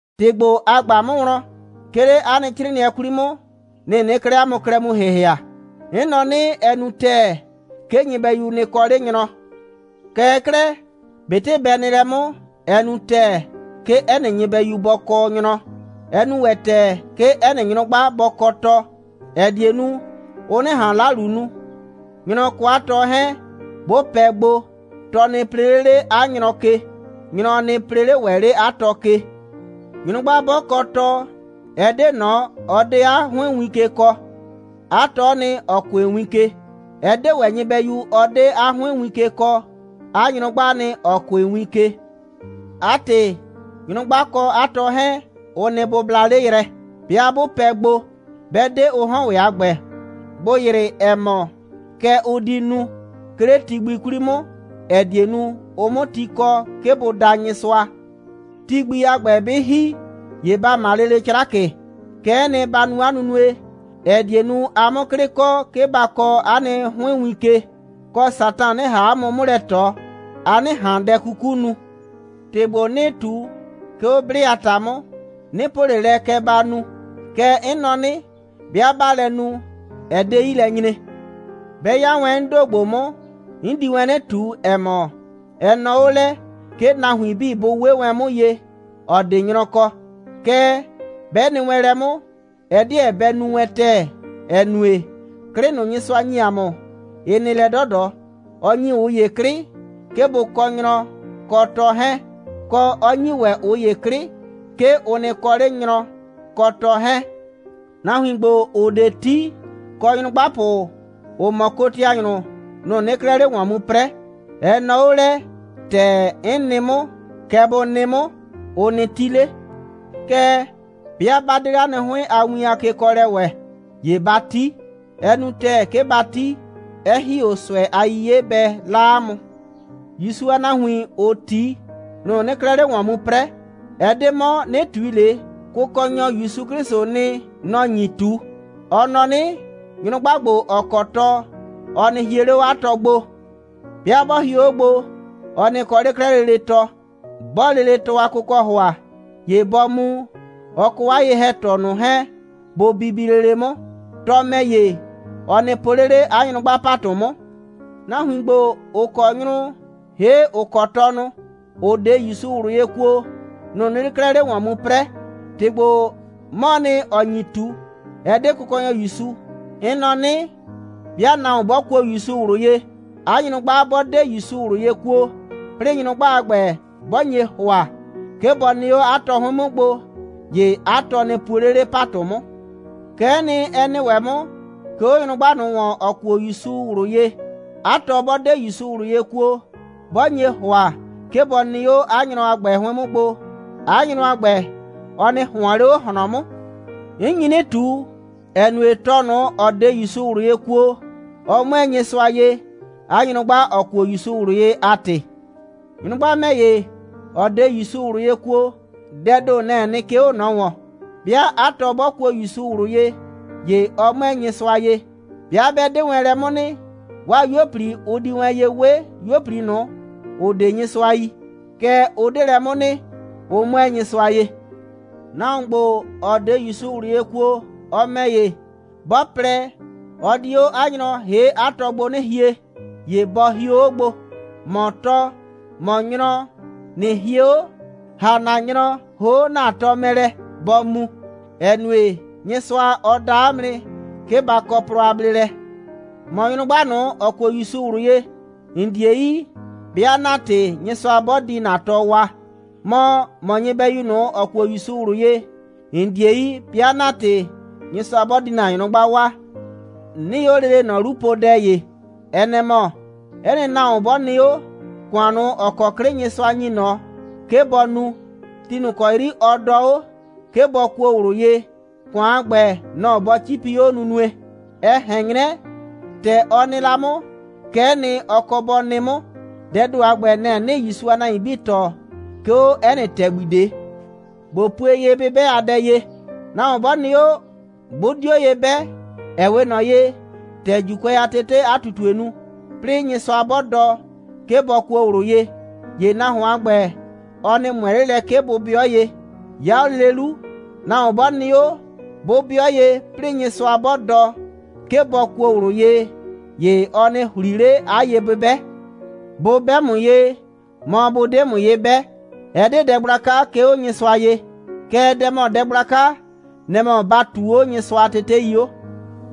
‑Tɩ ‑gbo, a ꞊gba 'mʋ wlɔn, 'ke 'le 'a nɩ 'crɩɩnɩɛ 'kwli 'mʋ, nɩ‑ 'nɩɩ 'klɛɛ 'a mʋ klɛ mu ‑hɩhɩa. 'N nɔ 'nɩ: Ɛ nu ‑tɛɛ, 'ke nyɩbɛyu nɩ kɔ 'le nyrɔ. Kɛɛ 'klɛɛ, ꞊betɩ bɛ nɩ lɛ 'mʋ, ɛ nu ‑tɛɛ, 'ke 'ɛ nɩ nyɩbɛyu bɔ kɔ nyrɔ, 'ɛ nu ‑wɛ ‑tɛɛ, 'ke 'ɛ nɩ nyrʋgba bɔ kɔ tɔ, ‑ɛ die nu, ʋ 'nɩ ꞊han 'lalu nu. Nyrɔ kɔ 'a tɔ 'hɛɛn, 'bʋ pɛ gbo, tɔ nɩ plee 'le 'le 'a nyrɔ ke, nyrɔ nɩ plee 'le ‑wɛ 'le 'a tɔ ke. Nyrʋgba 'bɔ kɔ tɔ, ɛ 'de ꞊nɔ, ɔ 'de 'a 'hʋɩn win ke kɔɔ. 'A tɔ'ɔ nɩ, ‑ɔ kʋɩ win ke. Ɛ 'de ‑wɛ nyɩbɛyu, ɔ 'de 'a 'hʋɩn win ke kɔɔ. 'A nyrʋgbaa nɩ, ‑ɔ kʋɩ win ke. 'A ‑tɩ, nyrʋgba kɔ 'a tɔ 'hɛɛn, ʋ nɩ bʋbla 'le yrɛ, 'bɩa 'bʋ pɛ gbo, 'bɛ 'de ʋ 'hɔn ‑wɛ a ‑gbɛ, bʋ ‑yrɩ, ‑ɛ mɔ, kɛ ʋ di nu, 'ke 'le ti gbi 'kwli 'mʋ, ‑ɛ die nu, ʋ 'mʋ ti kɔ, 'ke bʋ da Nyɩsʋa. Ti gbi a ‑gbɛ 'bɩ ‑hi, ‑ye ba ‑ma lele 'crakɩ. Kɛ'ɛ nɩ, ba nu 'a nunue, ‑ɛ die nu, a 'mʋ 'klɩ kɔ, 'ke ba kɔɔ 'a nɩ 'hʋɩn win ke, kɔ, Satan 'nɩ ꞊han 'a mʋ 'mʋ lɛ ꞊tɔ, a 'nɩ ꞊han dɛ 'kuku nu. ‑Tɩ ‑gbo 'nɩɩ ꞊tu, 'ke 'o 'blɩ a ‑ta 'mʋ, 'nɩ po ꞊le lɛ, kɛ ba nu. Kɛɛ, 'n nɔ 'nɩ: 'Bɩa 'baa lɛ nu, ɛ 'de 'yi lɛ nyre. 'Bɛ 'ya wɛn 'n ‑do ‑gbo 'mʋ, 'n di wɛn 'nɩ ꞊tu, ‑ɛ mɔ, ɛ nɔɔ 'o lɛ, 'ke nahuin 'bii bʋ 'we wɛn 'mʋ ye, ‑ɔ 'de nyrɔ kɔ. Kɛɛ, 'bɛ nɩ wɛn lɛ 'mʋ, ɛ 'deɛ bɛ nu wɛn ‑tɛɛ, ‑ɛ nue, 'klɩ ꞊nʋ, Nyɩsʋa ‑nyi ‑a mʋ, ɩ nɩ lɛ 'dɔdɔ. Ɔ ‑nyi ꞊ʋ ‑ye 'klɩ, 'ke bʋ kɔ nyrɔ kɔ tɔ 'hɛɛn, kɔ, 'ɔ ‑nyi ‑wɛ ꞊ʋ ‑ye 'klɩ, 'ke ʋ nɩ kɔ 'le nyrɔ kɔ tɔ 'hɛɛn. Nahuin ‑gbo, ‑ʋ 'de 'ti, kɔ nyrʋgbapʋ, ‑ʋ mɔ kotianyrʋ, nʋ‑ 'nɩɩ 'klɛɛ 'le ‑wɔn mu 'prɛɛ. Ɛ nɔɔ 'o lɛ, ‑tɛ 'n nɩ 'mʋ, kɛ bʋ nɩ 'mʋ, ʋ nɩ 'ti 'le. Kɛɛ, 'bɩa 'ba 'de 'le 'a nɩ 'hʋɩn a win a kekɔɔlɛ ‑wɛ, ‑ye ba 'ti. Ɛ nu ‑tɛɛ, 'ke ba 'ti, 'ɛ ‑hi 'o ꞊sʋɛ a 'yiye 'bɛ 'la 'a mʋ. ‑Yusu a nahuin, ‑ʋ 'ti, nʋ‑ 'nɩɩ 'klɛɛ 'le ‑wɔn mu 'prɛɛ. Ɛ 'de 'mɔ, 'nɩ ꞊tui ꞊le, Kʋkɔnyɔ ‑Yusu 'Klɩsʋʋ nɩ, nɔ‑ nyi ꞊tu. Ɔ nɔ 'nɩ: Nyrʋgba ‑gbo, ‑ɔ kɔ tɔ, ɔ nɩ hie 'le 'o 'a tɔ gbo. 'Bɩa 'bɔ hio 'o gbo, ɔ nɩ kɔ 'le 'klɛɛ lele tɔ. 'Bɔɔ lele tɔ a kʋkɔ ‑hʋa, ‑ye bɔ mu, ɔ kɔ 'a ye‑hɛtɔ ꞊nʋ 'hɛɛn, bʋ bibi lele 'mʋ. Tɔ ‑mɛ ‑ye, ɔ nɩ po 'le 'le 'a nyrʋgba ‑patʋ 'mʋ. Nahuin ‑gbo, ‑ʋ kɔ nyrʋ, ‑hee' ‑ʋ kɔ tɔnʋ, ‑ʋ 'de ‑Yusu ꞊wlʋ ye kuo, nʋ‑ 'nɩɩ 'klɛɛ 'le ‑wɔn mu 'prɛɛ. ‑Tɩ ‑gbo, 'mɔɔ nɩ, ‑ɔ nyi ꞊tu, ɛ 'de Kʋkɔnyɔ ‑Yusu. 'N nɔ 'nɩ: 'Bɩa nahuon 'bɔ kuo ‑Yusu ꞊wlʋ ye, 'a nyrʋgba 'bɔ 'de ‑Yusu ꞊wlʋ ye kuo, 'plɩɩ nyrʋgba a ‑gbɛ, 'bɔ nye ‑hʋa, 'ke bɔ nɩ 'o 'a tɔ 'hʋɩn 'mʋ gbo, ‑ye 'a tɔ nɩ puo 'le 'le ‑patʋ 'mʋ. Kɛ'ɛ nɩ, ɛ nɩ ‑wɛ 'mʋ, 'ke 'o nyrʋgba ꞊nʋ ‑wɔn, ‑ɔ kuo ‑Yusu ꞊wlʋ ye. 'A tɔ 'bɔ 'de ‑Yusu ꞊wlʋ ye kuo, 'bɔ nye ‑hʋa, 'ke bɔ nɩ 'o 'a nyrɔ a ‑gbɛ 'hʋɩn 'mʋ gbo, 'a nyrɔ a ‑gbɛ, ɔ nɩ ꞊hʋɔn 'le 'o ꞊hlɔn 'mʋ. 'N nyi 'nɩ ꞊tu, ‑ɛ nue, tɔ ꞊nʋ, ‑ɔ 'de ‑Yusu ꞊wlʋ ye kuo, ɔ 'mʋɛɛ Nyɩsʋa ye, 'a nyrʋgba, ‑ɔ kuo ‑Yusu ꞊wlʋ ye a ‑tɩ. Nyrʋgba ‑mɛ ‑ye, ‑ɔ 'de ‑Yusu ꞊wlʋ ye kuo, dɛɛ ‑do, nɛ‑ɛ nɩ, 'ke 'o ꞊nɔ ‑wɔn. 'Bɩa 'a tɔ 'bɔ kuo ‑Yusu ꞊wlʋ ye, ‑ye ɔ 'mʋɛɛ Nyɩsʋa ye. 'Bɩa 'bɛ 'de wɛn lɛ 'mʋ nɩ, 'waa 'yuo꞊pli, ʋ di wɛn ye 'we 'yuo꞊pli ꞊nʋ, ‑ʋ 'de Nyɩsʋa yi. Kɛɛ, ʋ 'de lɛ 'mʋ nɩ. Ʋ 'mʋɛɛ Nyɩsʋa ye. Nahuon ‑gbo, ‑ɔ 'de ‑Yusu ꞊wlʋ ye kuo, ɔ ‑mɛ ‑ye, 'bɔ plɛ, ɔ di 'o 'a nyrɔ ‑hee' 'a tɔ gbo 'nɩ hie, ‑ye bɔ hio 'o gbo. ‑Mɔ tɔ, ‑mɔ nyrɔ, ꞊nɩ hie 'o, ‑ha ‑na nyrɔ ‑hoo' ‑na tɔ mɛ lɛ, bɔ mu, ‑ɛ nue, Nyɩsʋa, ɔ da 'a mʋ nɩ, 'ke ba kɔ plɔ a bleelɛ. ‑Mɔ nyrʋgba ꞊nʋ, ‑ɔ kuo ‑Yusu ꞊wlʋ ye, ‑n 'die yi, 'bɩa ‑na ‑tɩ, Nyɩsʋa 'bɔ di ‑na tɔ waa. Mɔ, ‑mɔ nyɩbɛyu ꞊nʋ, ‑ɔ kuo ‑Yusu ꞊wlʋ ye, ‑n 'die yi, 'bɩa ‑na ‑tɩ, Nyɩsʋa 'bɔ di ‑na nyrʋgba waa. 'Nɩɩ 'o lele ꞊nɔ 'lu po dɛ ‑ye. Ɛ nɛ‑ mɔ: 'Ɛ nɩ nahuon 'bɔ nɩ 'o, ‑kʋan ꞊nʋ, ‑ɔ kɔ 'klɩ Nyɩsʋa ‑nyi ꞊nɔ, 'ke bɔ nu, ti ꞊nʋ ‑kɔ 'yri ɔ dɔɔ 'o, 'ke bɔ kuo ꞊wlʋ ye, ‑kʋan a ‑gbɛ, nɔ‑ bɔ 'cipi 'o nunue. Ɛ ꞊hɛn 'nyrɛ, ‑tɛ ɔ nɩ la 'mʋ, kɛ'ɛ nɩ, ɔ kɔ bɔ nɩ 'mʋ. Dɛɛ ‑do a ‑gbɛ, nɛ‑ 'nɩɩ ‑Yusu a nahuin 'bii tɔɔ, 'ke 'o 'ɛ nɩ ‑tɛgbi ꞊de. ꞊Bo pue ye'bɩbɛ a dɛ ye: Nahuon 'bɔ nɩ 'o, 'bʋ 'dio ye 'bɛ, ‑ɛ 'we ꞊nɔ ye, ‑tɛ ‑Juukʋɛ a tetee 'a ꞊tutue nu, 'plɩɩ Nyɩsʋa 'bɔ dɔ, 'ke bɔ kuo ꞊wlʋ ye, ‑ye nahuon a ‑gbɛ, ɔ nɩ ꞊mʋɛ 'le lɛ, 'ke bʋ 'bɩɔ ye. 'Ya 'o lele 'lu, nahuon 'bɔ nɩ 'o, 'bʋ 'bɩɔ ye, 'plɩɩ Nyɩsʋa 'bɔ dɔ, 'ke bɔ kuo ꞊wlʋ ye, ‑ye ɔ nɩ ‑hli 'le 'a ye'bɩbɛ. Bʋ 'bɛ 'a mʋ ye, mɔ, bʋ 'de 'a mʋ ye 'bɛ, ɛ 'de dɛ gblaka, 'ke 'o Nyɩsʋa ye. Kɛɛ, dɛ ‑mɔ dɛ gblaka, nɛ‑ mɔ ‑ba ꞊tuu 'o Nyɩsʋa a tetei 'o.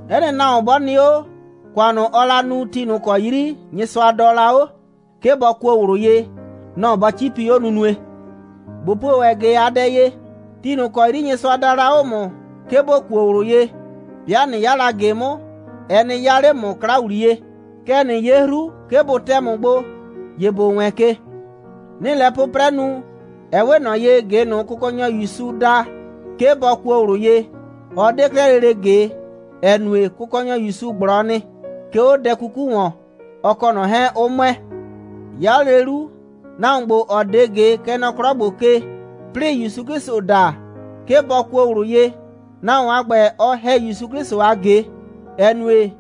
'Ɛ nɩ nahuon 'bɔ nɩ 'o, ‑kʋan ꞊nʋ, ɔɔ la nu, ti ꞊nʋ ‑kɔ 'yri Nyɩsʋa dɔɔ la 'o, 'ke bɔ kuo ꞊wlʋ ye, nɔ‑ bɔ 'cipi 'o nunue. ꞊Bo pue ‑wɛ ꞊ge a dɛ ye: Ti ꞊nʋ ‑kɔ 'yri Nyɩsʋa daa la 'o ‑mʋ, 'ke ‑bo kuo ꞊wlʋ ye, 'bɩa ꞊nɩ 'ya la ꞊ge 'mʋ, ɛ nɩ 'yaa 'le ‑mʋ 'kla ‑wliye. Kɛɛ, ꞊nɩ 'ye 'hru, 'ke bʋ tɛ ‑mʋ gbo, ‑ye ‑bo wɛɛn ke. 'Nɩɩ lɛ 'pʋprɛ nu, ɛ 'we ꞊nɔ ye, ꞊ge ꞊nʋ, Kʋkɔnyɔ ‑Yusu da, 'ke bɔ kuo ꞊wlʋ ye, ɔ 'de 'klɛɛ lele ꞊ge, ‑ɛ nue, Kʋkɔnyɔ ‑Yusu ꞊gblɔ nɩ, 'ke 'o dɛ 'kuku ‑wɔn, ɔ kɔ ꞊nɔ 'hɛɛn, 'ʋ ‑mʋɛ. 'Ya 'o lele 'lu, nahuon ‑gbo, ‑ɔ 'de ꞊ge, kɛ nɔ 'klɔ ‑gbo ke, 'plɩɩ ‑Yusu 'Klɩsʋ da, 'ke bɔ kuo ꞊wlʋ ye, nahuon a ‑gbɛ, ɔ ‑hɛ ‑Yusu 'Klɩsʋ a ꞊ge, ‑ɛ nue,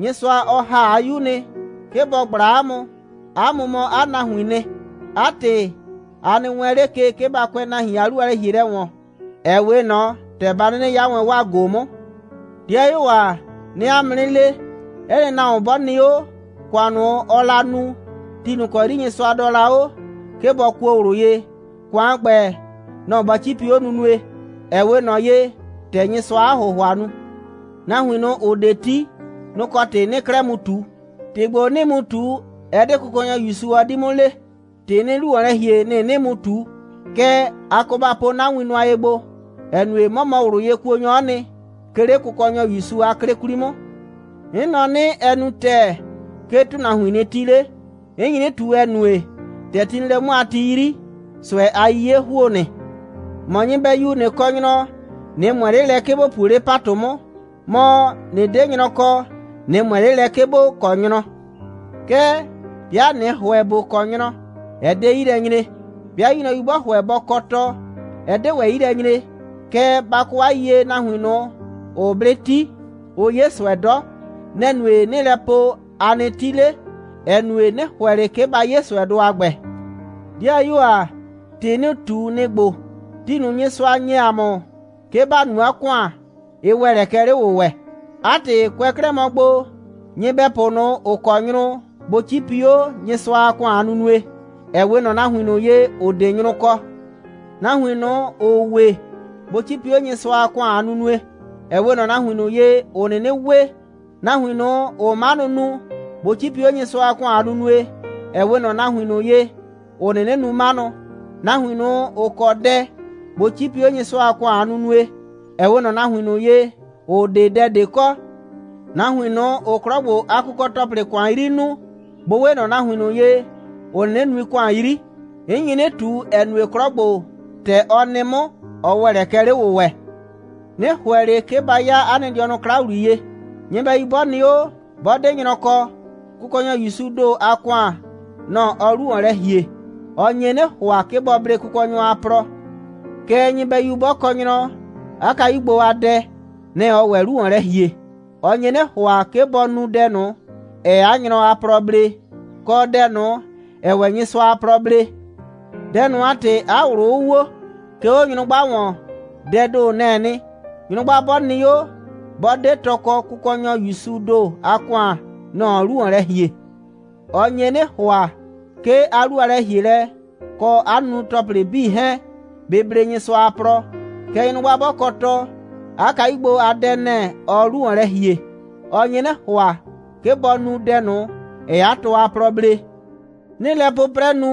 Nyɩsʋa, ɔ ‑ha 'a 'Yu nɩ, 'ke bɔ ꞊gbla 'a mʋ. 'A mʋ mɔ 'a nahuiin nɩ. 'A ‑tɩ, a nɩ wɛɛn 'le ke, 'ke ba kʋɛ nahuin a 'lu a lɛ‑hielɛ ‑wɔn, ‑ɛ 'we ꞊nɔ ‑tɛ ba 'nɩnɩ 'ya wɛn 'waa ꞊go 'mʋ. 'Dɩayuo ‑a, 'nɩɩ 'a mʋ 'nɩ le, 'ɛ nɩ nahuon 'bɔ nɩ 'o, ‑kʋan ꞊nʋ, ɔɔ la nu, ti ꞊nʋ ‑kɔ 'yri Nyɩsʋa dɔɔ la 'o, 'ke bɔ kuo ꞊wlʋ ye, ‑kʋan a ‑gbɛ, nɔ‑ bɔ 'cipi 'o nunue, ‑ɛ 'we ꞊nɔ ye, ‑tɛ Nyɩsʋaa 'a ‑hʋhʋa nu. Nahuin ꞊nʋ, ‑ʋ 'de 'ti, nʋ‑ kɔ ‑tɩ 'nɩɩ 'klɛɛ mu ꞊tu. ‑Tɩ ‑gbo 'nɩɩ mu ꞊tu, ɛ 'de Kʋkɔnyɔ ‑Yusu, ɔ 'di 'mʋ le. ‑Tɩ 'nɩɩ 'lu ‑wɔn lɛ ‑hie, nɩ‑ 'nɩɩ mu ꞊tu. Kɛɛ, a kɔ ba po 'na win nʋa ye gbo, ‑ɛ nue, 'mɔ mɔ ꞊wlʋyekuonyɔ'ɔ nɩ, 'ke 'le Kʋkɔnyɔ ‑Yusu a 'klɩ 'kwli 'mʋ. 'N nɔ 'nɩ, ɛ nu ‑tɛɛ, 'ke nahuin nɩ 'ti 'le. 'N nyi 'nɩ ꞊tu, ‑ɛ nue, ‑tɛ ti nɩ lɛ 'mʋ a ti 'yri, ꞊sʋɛ a 'yiye ‑huo nɩ. ‑Mɔ nyɩbɛyu, ꞊nɩ kɔ nyrɔ, ꞊nɩ ꞊mʋɛ 'le lɛ, 'ke ‑bo puo 'le ‑patʋ 'mʋ. Mɔ, ꞊nɩ 'de nyrɔ kɔ, ꞊nɩ ꞊mʋɛ 'le lɛ, 'ke ‑bo kɔ nyrɔ. Kɛɛ, 'bɩa ꞊nɩ ‑hʋɛ ‑bo kɔ nyrɔ, ɛ 'de 'yi lɛ nyre. 'Bɩa 'yu nyrɔyu 'bɔ ‑hʋɛ bɔ kɔ tɔ, ɛ 'de ‑wɛ 'yi lɛ nyre. Kɛɛ, ba kɔ 'a yiyie, nahuin ꞊nʋ, ‑ʋʋ 'blɩ 'ti, ʋʋ 'ye ꞊sʋɛ 'dɔ. Nɛ‑ nue, 'nɩɩ lɛ po, a nɩ 'ti 'le, ‑ɛ nue, 'nɩ ‑hʋɛ ꞊le, 'ke ba 'ye ꞊sʋɛdʋ a ‑gbɛ. 'Dɩayuo ‑a, ‑tɩ 'nɩɩ ꞊tu, nɩ‑ ‑gbo: Ti ꞊nʋ, Nyɩsʋa ‑nye ‑a mʋ, 'ke ‑ba nu 'a ‑kʋan, ɩ ‑wɛ lɛ kɛ 'le‑wʋwɛ. 'A ‑tɩ, kʋɛ 'klɛɛ mɔ gbo, nyɩbɛpʋ ꞊nʋ, ‑ʋ kɔ nyrʋ, bʋ 'cipi 'o Nyɩsʋa a ‑kʋan a nunue, ‑ɛ 'we ꞊nɔ nahuin ꞊nʋ ye, ‑ʋ 'de nyrʋ kɔ. Nahuin ꞊nʋ, ‑ʋʋ we, bʋ 'cipi 'o Nyɩsʋa a ‑kʋan a nunue, ‑ɛ 'we ꞊nɔ nahuin ꞊nʋ ye, ‑ʋ 'nɩnɩ we. Nahuin ꞊nʋ, ‑ʋʋ 'manʋ nu, bʋ 'cipi 'o Nyɩsʋa a ‑kʋan a nunue, ‑ɛ 'we ꞊nɔ nahuin ꞊nʋ ye, ‑ʋ 'nɩnɩ nu 'manʋ. Nahuin ꞊nʋ, ‑ʋ kɔ dɛ, bʋ 'cipi 'o Nyɩsʋa a ‑kʋan a nunue, ‑ɛ 'we ꞊nɔ nahuin ꞊nʋ ye, ‑ʋ 'de dɛ ꞊de kɔ. Nahuin ꞊nʋ, ‑ʋʋ 'klɔ ‑gbo a kʋkɔ‑tɔplɩ ‑kʋan 'yri nuu, bʋ 'we ꞊nɔ nahuin ꞊nʋ ye, ‑ʋ 'nɩnɩ nui ‑kʋan 'yri. 'N nyi 'nɩ ꞊tu, ‑ɛ nue, 'klɔ ‑gbo, ‑tɛ ɔ nɩ 'mʋ, ɔ ‑wɛ lɛ kɛ 'le‑wʋwɛ. 'Nɩ ‑hʋɛ ꞊le, 'ke ba 'yaa 'a nɩ dɩɔnʋ 'kla ‑wliye. Nyɩbɛyu 'bɔ nɩ 'o, 'bɔ 'de nyrɔ kɔ, Kʋkɔnyɔ ‑Yusuu ‑do a ‑kʋan, nɔ‑ ɔɔ 'lu ‑wɔn lɛ ‑hie. Ɔ nye 'nɩ ‑hʋa, 'ke bɔ blee Kʋkɔnyɔ a plɔ. Kɛɛ, nyɩbɛyu 'bɔ kɔ nyrɔ, 'a kayu gbo a dɛ, nɛ‑ ɔɔ ‑wɛ 'lu ‑wɔn lɛ ‑hie. Ɔ nye 'nɩ ‑hʋa, 'ke bɔ nu dɛ ꞊nʋ, ‑ɛɛ 'a nyrɔ a plɔ blee, kɔ dɛ ꞊nʋ, ‑ɛɛ ‑wɛ Nyɩsʋa a plɔ blee. Dɛ ꞊nʋ a ‑tɩ, 'a ꞊wlʋ 'ʋ wo. 'Ke 'o nyrʋgba ‑wɔn, dɛɛ ‑do, nɛ‑ɛ nɩ. Nyrʋgba 'bɔ nɩ 'o, 'bɔ 'de tɔ kɔ, Kʋkɔnyɔ ‑Yusuu ‑do a ‑kʋan, nɔ‑ ɔɔ 'lu ‑wɔn lɛ ‑hie. Ɔ nye 'nɩ ‑hʋa, 'ke 'a 'lu a lɛ‑hielɛ, kɔ 'a nunu‑tɔplɩ 'bii 'hɛɛn, bɩ blee Nyɩsʋa a plɔ. Kɛɛ, nyrʋgba 'bɔ kɔ tɔ, 'a kayu gbo a dɛ, nɛ‑ ɔɔ 'lu ‑wɔn lɛ ‑hie. Ɔ nye 'nɩ ‑hʋa, 'ke bɔ nu dɛ ꞊nʋ, ‑ɛɛ 'a tɔ a plɔ blee. 'Nɩɩ lɛ 'pʋprɛ nu,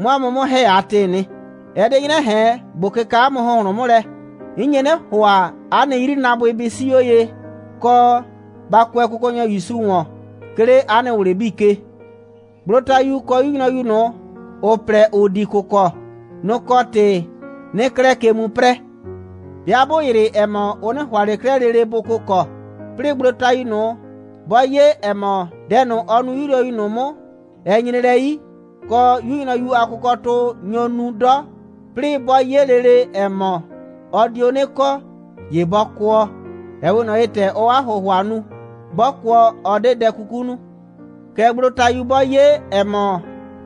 'mʋ 'a mʋ 'mʋ ‑hɛ a ‑tɩɩ nɩ. Ɛ 'de 'nyrɛ ꞊hɛn, ꞊bo kɩka 'a mʋ ‑hʋnhlʋn 'mʋ lɛ. 'N nye 'nɩ ‑hʋa, 'a nɩ 'yrinaabʋɩ bɩ 'sii 'o ye, kɔ, ba kʋɛ Kʋkɔnyɔ ‑Yusu ‑wɔn, 'ke 'le 'a nɩ ꞊wlɩ 'bii ke. Gblotayu kɔ 'yu nyrɔyu ꞊nʋ, ‑ʋ plɛ, ‑ʋ di kʋkɔ, nʋ‑ kɔ ‑tɩ 'nɩɩ 'klɛɛ ke mu 'prɛɛ. 'Bɩa 'bʋ ‑yrɩ, ‑ɛ mɔ, ʋ 'nɩ ‑hʋa ꞊le 'klɛɛ lele bʋ kʋkɔ, 'plɩɩ gblotayu ꞊nʋ, 'bɔ 'ye, ‑ɛ mɔ, dɛ ꞊nʋ, ɔ nu 'yu nyrɔyu ꞊nʋ 'mʋ, ɛ nyre lɛ 'yi, kɔ, 'yu nyrɔyu a kʋkɔtʋ nyo nu 'dɔ, 'plɩɩ 'bɔ 'ye lele, ‑ɛ mɔ, ɔ dio 'nɩ kɔ, ‑ye bɔ kʋɔ, ‑ɛ 'we ꞊nɔ ye, ‑tɛ ɔɔ 'a ‑hʋhʋa nu. 'Bɔ kʋɔ, ɔ 'de dɛ 'kuku nu. Kɛɛ, gblotayu 'bɔ 'ye, ‑ɛ mɔ,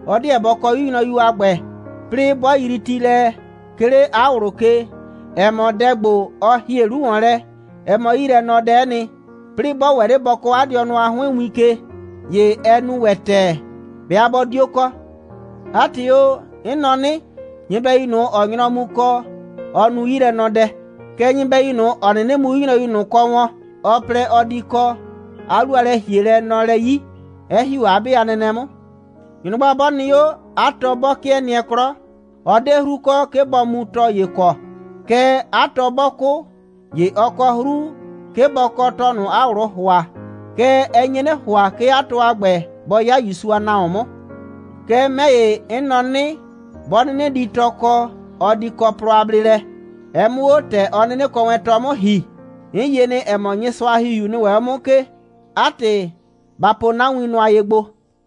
ɔ 'deɛ bɔ kɔ 'yu nyrɔyu a ‑gbɛ, 'plɩɩ 'bɔ yrii ti lɛ, 'ke 'le 'a ꞊wlʋ ke, ‑ɛ mɔ, dɛ ‑gbo, ‑ɔ ‑hie 'lu ‑wɔn lɛ, ɛ mɔ 'yilɛnɔdɛ'ɛ nɩ, 'plɩɩ 'bɔ ‑wɛ 'le bɔ kɔɔ 'a dɩɔnʋ a 'hʋɩn win ke, ‑ye ɛ nu ‑wɛ ‑tɛɛ, 'bɩa 'bɔ 'dio kɔ. 'A ‑tɩ o, 'n nɔ 'nɩ: Nyɩbɛyu ꞊nʋ, ‑ɔɔ nyrɔ mu kɔ, ɔ nu 'yilɛnɔdɛ. Kɛɛ, nyɩbɛyu ꞊nʋ, ‑ɔ 'nɩnɩ mu 'yu nyrɔyu ꞊nʋ kɔ wɔn, ɔ plɛ, ɔ di kɔ, 'a 'lu a lɛ‑hielɛ nɔ lɛ 'yi, 'ɛ ‑hi 'o 'a 'be a nɛnɛ 'mʋ. Nyrʋgba 'bɔ nɩ 'o, 'a tɔ 'bɔ 'kɩɛ nɩɛ 'klɔ, ɔ 'de 'hru kɔ, 'ke bɔ mu tɔ ‑ye kɔ. Kɛɛ, 'a tɔ 'bɔ 'kʋ, ‑ye ɔ kɔ 'hru, 'ke bɔ kɔ tɔ ꞊nʋ, 'a ꞊wlʋʋ ‑hʋa. Kɛɛ, ɛ nye 'nɩ ‑hʋa, 'ke 'a tɔ a ‑gbɛ bɔ 'ya ‑Yusu a nahuon 'mʋ. Kɛɛ, 'mɛ ‑ye, 'n nɔ 'nɩ, 'bɔ 'nɩnɩ di tɔ kɔ, ɔ di kɔ plɔ a bleelɛ, ɛ 'mʋ 'o ‑tɛ ɔ 'nɩnɩ kɔ wɛn tɔ 'mʋ ‑hi. 'N yie nɩ, ‑ɛ mɔ, Nyɩsʋa a ‑Hihiu nɩ ‑wɛ 'o 'mʋ 'mʋ ke. 'A ‑tɩ, ba po 'na win nʋa ye gbo.